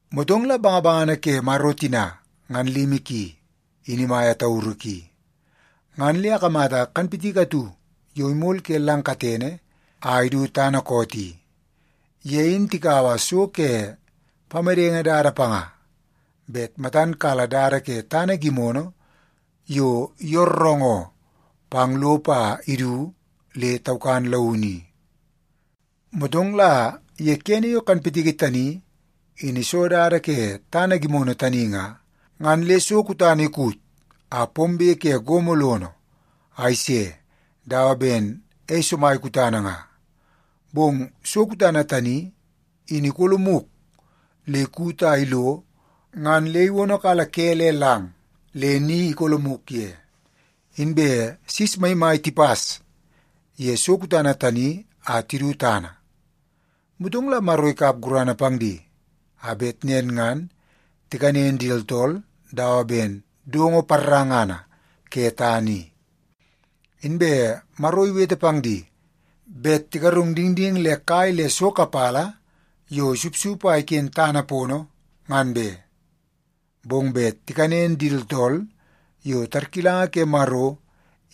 Motong la bangabangana ke Maro tina ngan limi ki, in imaia tauru ki, ngan le akamata kanpitiki atu yo imol ke lang katene a idu tana koot i. Ye in tikaua so ke pamedenge dada panga bet matan kala dada ke tana gimono yo yooroongoo pang lopo a idu le taukan launu i. Motong la ye kene yo kanpitiki tani, in iso dada ke tana gimono tani nga, ngan le so kutana ikut a pombe ke gomo lono a ise dawa ben ei somai kutana nga. Bong so kutana tani, in ikolomuk le ikut a ilo ngan le iwonokala ke le lang le ni ikolomuk ye. Inbe sis maimai tipas ye so kutana tani a tidu tana. Motong la Maro ikap gurana pang di a bet nen ngan tikanen di tooltool dawa ben dongo parangana ke tana i. Inbe Maro iwete pang di bet tigarung dingding le kai le so kapala yo isupsup a iken tana pono ngan be, bong bet tikanen di tooltool yo tarkilanga ke Maro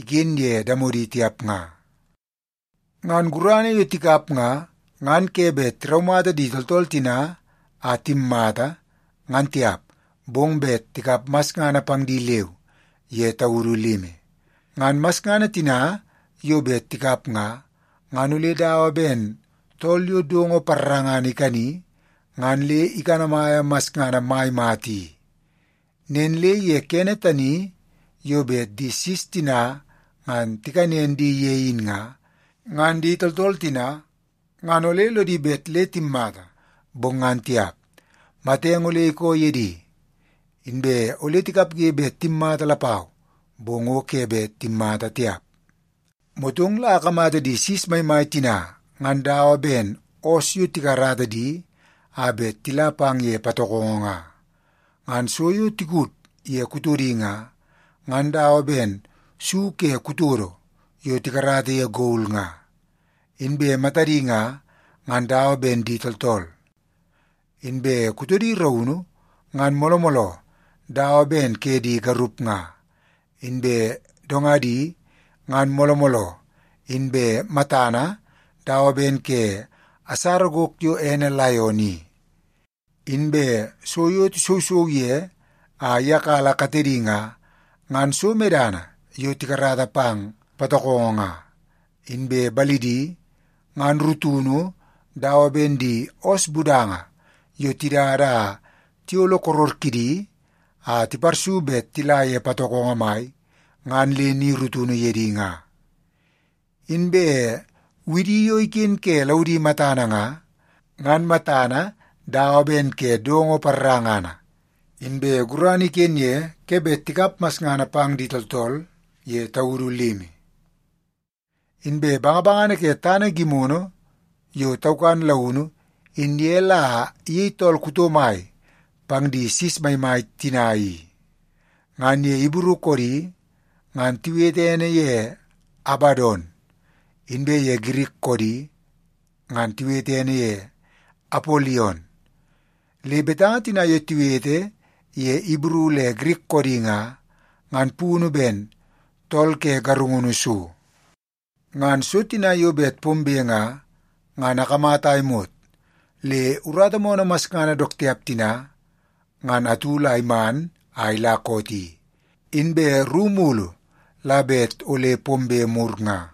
iken ye damodi tiap nga. Ngan gurana yo tikap nga, ngan ke bet tiraumata di tooltool tina a timmata, ngan tiap, bong bet tikap masngana pang di leu ye taudu limi. Ngan masngana tina yo bet tikap nga, ngan ole dawa ben tool yo dongo parangana ikani ngan le ikanamaia masngana mai mata i. Nen le ye kene tani yo bet di sis tina ngan tikanen di ye in nga, ngan di tooltool tina ngan ole lodi bet le timmata, bong ngan tiap, matenge ole ikoo ye di. Inbe ole tikapge bet timmata lapau, bong o ke bet timmata tiap. Motong la akamata di sis maimai tina ngan dawa ben oos yo tikarata di a bet tila pang ye patokongo nga. Ngan so yo tikud ye kutodi nga, ngan dawa ben su ke kutodo yo tikarata ye gol nga. Inbe matadi nga, ngan dawa ben di tooltool. Inbe kutodi raunu, ngan mooloo mooloo dawa ben ke di garup nga. Inbe dongadi, ngan mooloo mooloo inbe matana dawa ben ke asara gok yo ene laion i. Inbe so yo tisousou ye a iyakala katedi nga, ngan so medana yo tikarata pang patokongo nga. Inbe balidi, ngan rutunu dawa ben di oos budanga yo tidada a tiyolo koror kidi a tiparsuk bet tila ye patokongo mai ngan le ni rutunu ye di nga. Inbe widi yo iken ke laudi matana nga, ngan matana dawa ben ke dongo parangana, inbe gurana iken ye ke bet tikap masngana pang di tooltool ye taudu limi. Inbe bangabangana ke tana gimono yo taukan launu in ye la iyei tool kuto mai pang di sis maimai tina i. Ngan ye Ibru koodi ngan tiwete ene ye Abadon, inbe ye Girik koodi ngan tiwete ene ye Apolion. Le betanga tina yo tiwete ye Ibru le Girik koodi nga, ngan punu ben Tool Ke Garungunu So. Ngan so tina yo bet pombe nga, ngan akamata a imot le urata moonoo masngana dook tiap tina ngan atu la iman a ila koot i, inbe ru mulu la bet ole pombe mur nga.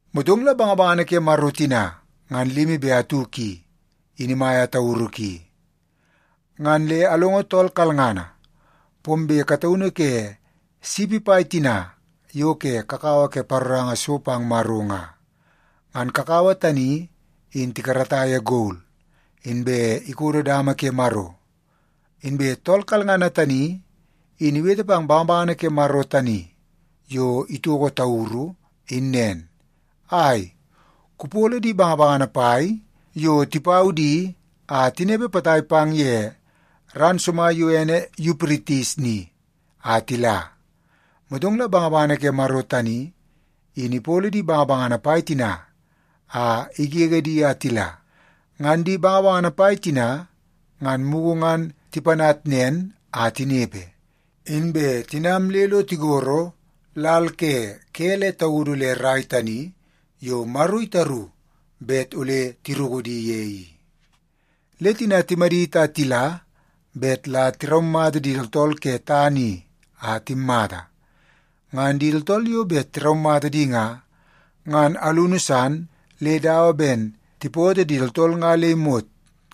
Motong la bangabangana ke Maro tina ngan limi be atu ki, in imaia tauru ki, ngan le alongo tool kalngana pombe kataunu ke sipi pai tina yo ke kakawa ke paroranga so pang Maro nga. Ngan kakawa tani in tikarata ye gol, inbe ikodo dama ke Maro. Inbe tool kalngana tani in iwete pang bangabangana ke Maro tani yo itoko tauru in nen, “Ai, kupolo di bangabangana pai yo tipau di a tinepe potai pang ye ran somai yo ene Yupritis ni a tila.” Motong la bangabangana ke Maro tani in ipolo di bangabangana pai tina a igege di a tila. Ngan di bangabangana pai tina ngan mugu ngan tipanat nen a tinepe, inbe tinam le lo tigoro lal ke ke le taudu le rai tani yo Maro itaru bet ole tiruku di ye i. Le tina timadit a tila bet la tiraumata di tooltool ke tana i a timmata. Ngan di tooltool yo bet tiraumata di nga, ngan alunu san le dawa ben tipoto di tooltool nga le imot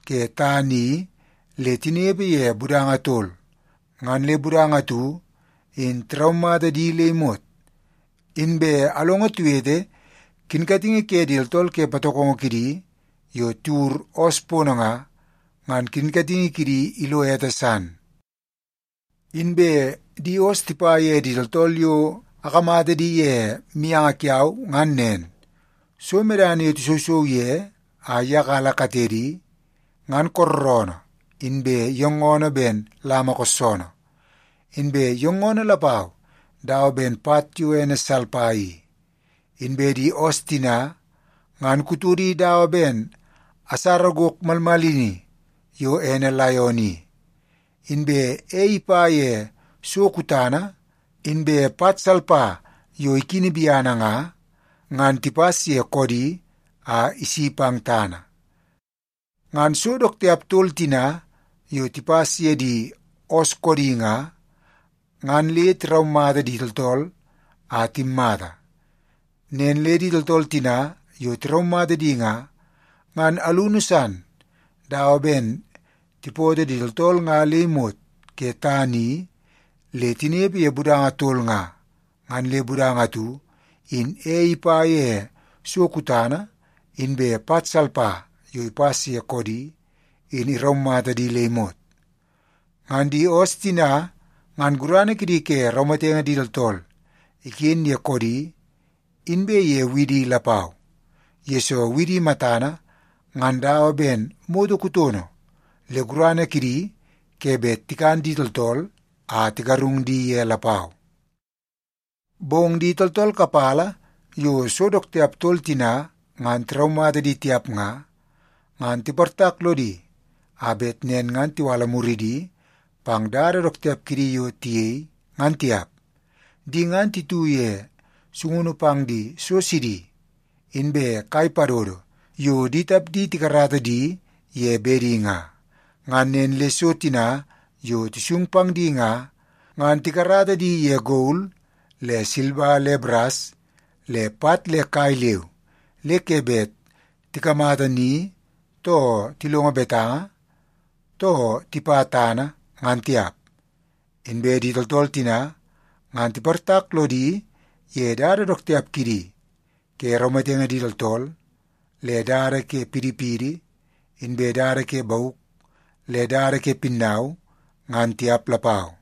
ke tana i le tinepe ye budanga tol, ngan le budanga atu in tiraumata di le imot. Inbe alongo tiwete kinkatingi ke di tooltool ke patokongo kidi yo tiwur oos pono nga, ngan kinkatingi kidi ilo ete san. Inbe di oos tipa ye di tooltool yo akamata di ye mianga kiau ngan nen: So medana yo tisousou ye a iyakala katedi, ngan kooroonoo inbe yoongoonoo ben lama koossoonoo, inbe yoongoonoo lapau dawa ben pat yo ene salpa i. Inbe di oos tina, ngan kutodi dawa ben asara gok malmalini yo ene laion i, inbe ei ipa ye so kutana inbe pat salpa yo ikini biana nga, ngan tipas ye koodi a isi pang tana. Ngan so dook tiap tol tina yo tipas ye di oos koodi nga, ngan le tiraumata di tooltool a timmata. Nen le di tooltool tina yo tiraumata di nga, ngan alunu san dawa ben tipoto di tooltool nga le imot ke tana i le tinepe ye budanga tol nga, ngan le budanga atu in ei ipa ye so kutana inbe pat salpa yo ipas ye koodi, in iraumata di le imot. Ngan di oos tina, ngan gurana kidi ke raumatenge di tooltool iken ye koodi inbe ye widi lapau, yesoo widi matana ngan dawa ben moto kutono le gurana kidi ke bet tikan di tooltool a tigarung di ye lapau. Bong di tooltool kapala yo so dook tiap tol tina ngan tiraumata di tiap nga, ngan tiportak lodi a bet nen ngan tiwala muridi pang dada dook tiap kidi yo tiyei ngan tiap. Di ngan titu ye sungunu pang di so sidi inbe kai padodo yo di tapdi tikarata di ye bedi nga. Ngan nen le so tina yo tisung pang di nga, ngan tikarata di ye gol le silba le baras le pat le kai leu, le ke bet tikamata ni, too tilongo betanga, too tipa tana, ngan tiap. Inbe di tooltool tina, ngan tiportak lodi ye dada dook tiap kidi ke raumatenge di tooltool, le dada ke pidipidi, inbe dada ke bauk, le dada ke pinnau, ngan tiap lapau.